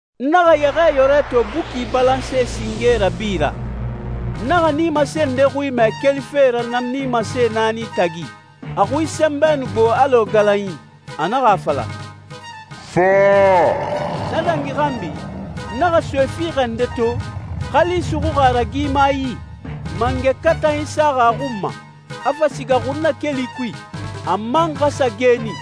N naxa Yɛxɛɛyɔrɛ to buki balanse singe rabi ra. N naxa nimase nde xui mɛ kelife na nimase naani tagi. A xui sɛnbɛ nu gbo alɔ galanyi. A naxa a fala, «Fa.» Na dangi xanbi, n naxa soe fiixɛ nde to, xali suxuxi a ragima yi, mangɛ katanyi saxi a xun ma, a fa siga xunnakeli kui, a man xa sa geeni.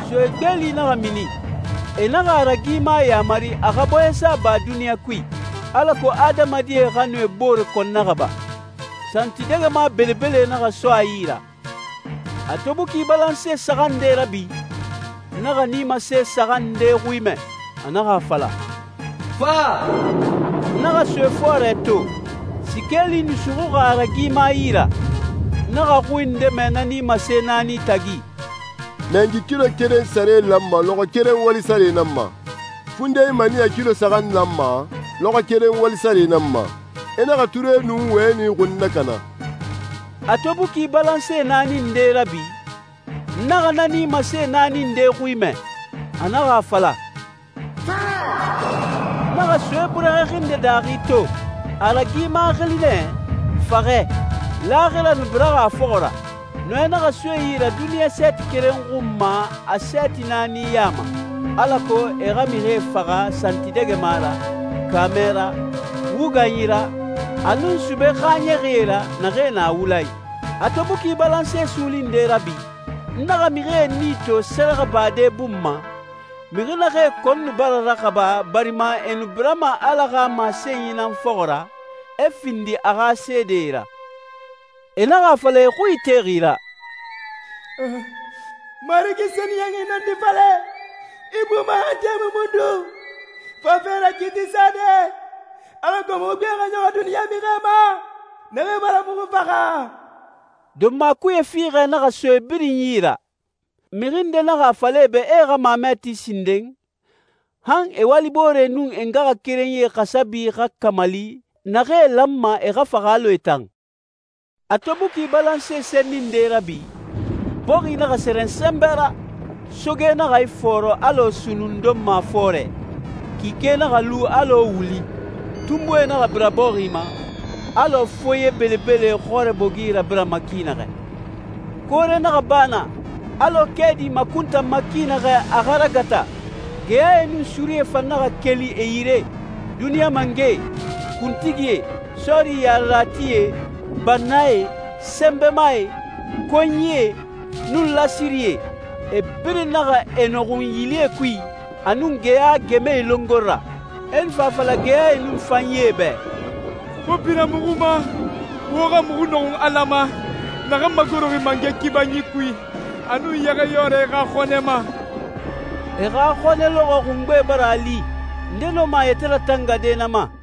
Soe gbeeli naxa mini. E naxa a ragima yamari a xa bɔɲɛsa ba duniɲa kui, alako adamadie xa nu e bore kɔn naxaba. Santidɛgɛma belebele naxa so a yi ra. A to buki balanse saxan nde rabi, n naxa nimase saxan nde xui mɛ. A naxa a fala, «Fa.» N naxa soe fɔɔrɛ to. Sikeeli nu suxuxi a ragima yi ra. N naxa xui nde mɛ na nimase naani tagi, «Mɛngi kilo keren sare lanma lɔxɔɛ keren wali sare nan ma. Fundenyi maniyɛ kilo saxan lanma lɔxɔɛ keren wali sare nan ma. I naxa ture nun wɛni xun nakana.» A to buki balanse naani nde rabi, n naxa na nimase naani nde xui mɛ. A naxa a fala, «Fa.» N naxa soe burɛxɛ xinde daaxi to. A ragima xili nɛ «Faxɛ,» laaxira nu biraxi a fɔxɔ ra. Nɔɛ naxa so e yi ra duniɲa sɛɛti keren xun ma a sɛɛti naani ya ma, alako e xa mixie faxa santidɛgɛma ra, kaamɛ ra, wuganyi ra, a nun sube xaaɲɛxie ra, naxee na wula i. A to buki balanse suuli nde rabi, n naxa mixie nii to sɛrɛxɛbade bun ma, mixi naxee kɔn nu bara raxaba barima e nu birama Ala xa masenyi nan fɔxɔ ra, e findi a xa seedee ra. E naxa a fala e xui itexi ra, «Marigi sɛniyɛnxi nɔndi falɛ, i buma han tɛmui mundun fafe ra kiiti sade, alako muxu gbe xa ɲɔxɔ duniɲa mixie ma naxee bara muxu faxa?» Donma kuye fiixɛ naxa so e birin yi ra. Mixi nde naxa a fala e bɛ e xa mamɛ ti sinden, han e walibooree nun e ngaxakerenyie xasabi xa kamali naxee lanma e xa faxa alɔ e tan. A to buki balanse senni nde rabi, bɔxi naxa sɛrɛn sɛnbɛ ra, soge naxa ifɔɔrɔ alɔ sunnun donma fɔɔrɛ, kike naxa lu alɔ wuli, tunbuie naxa bira bɔxi ma, alɔ foye belebele xɔrɛ bogi rabirama ki naxɛ. Koore naxa ba na, alɔ kɛɛdi makuntanma ki naxɛ a xa ragata. Geyae nun surie fan naxa keli e yire. Duniɲa mangɛe, kuntigie, sɔɔri yareratie, bannae, sɛnbɛmae, konyie, nun lasirie, e birin naxa e nɔxun yilie kui a nun geya gɛmɛe longori ra. E nu fa a fala geyae nun fanyee bɛ, «Wo bira muxu ma, wo xa muxu nɔxun Ala ma, naxan magoroxi mangɛ kibanyi kui, a nun Yɛxɛɛyɔrɛ xa xɔnɛ ma.» E xa xɔnɛ lɔxɔɛ xungbe bara a li. Nde nɔma a yɛtɛ ratangade na ma?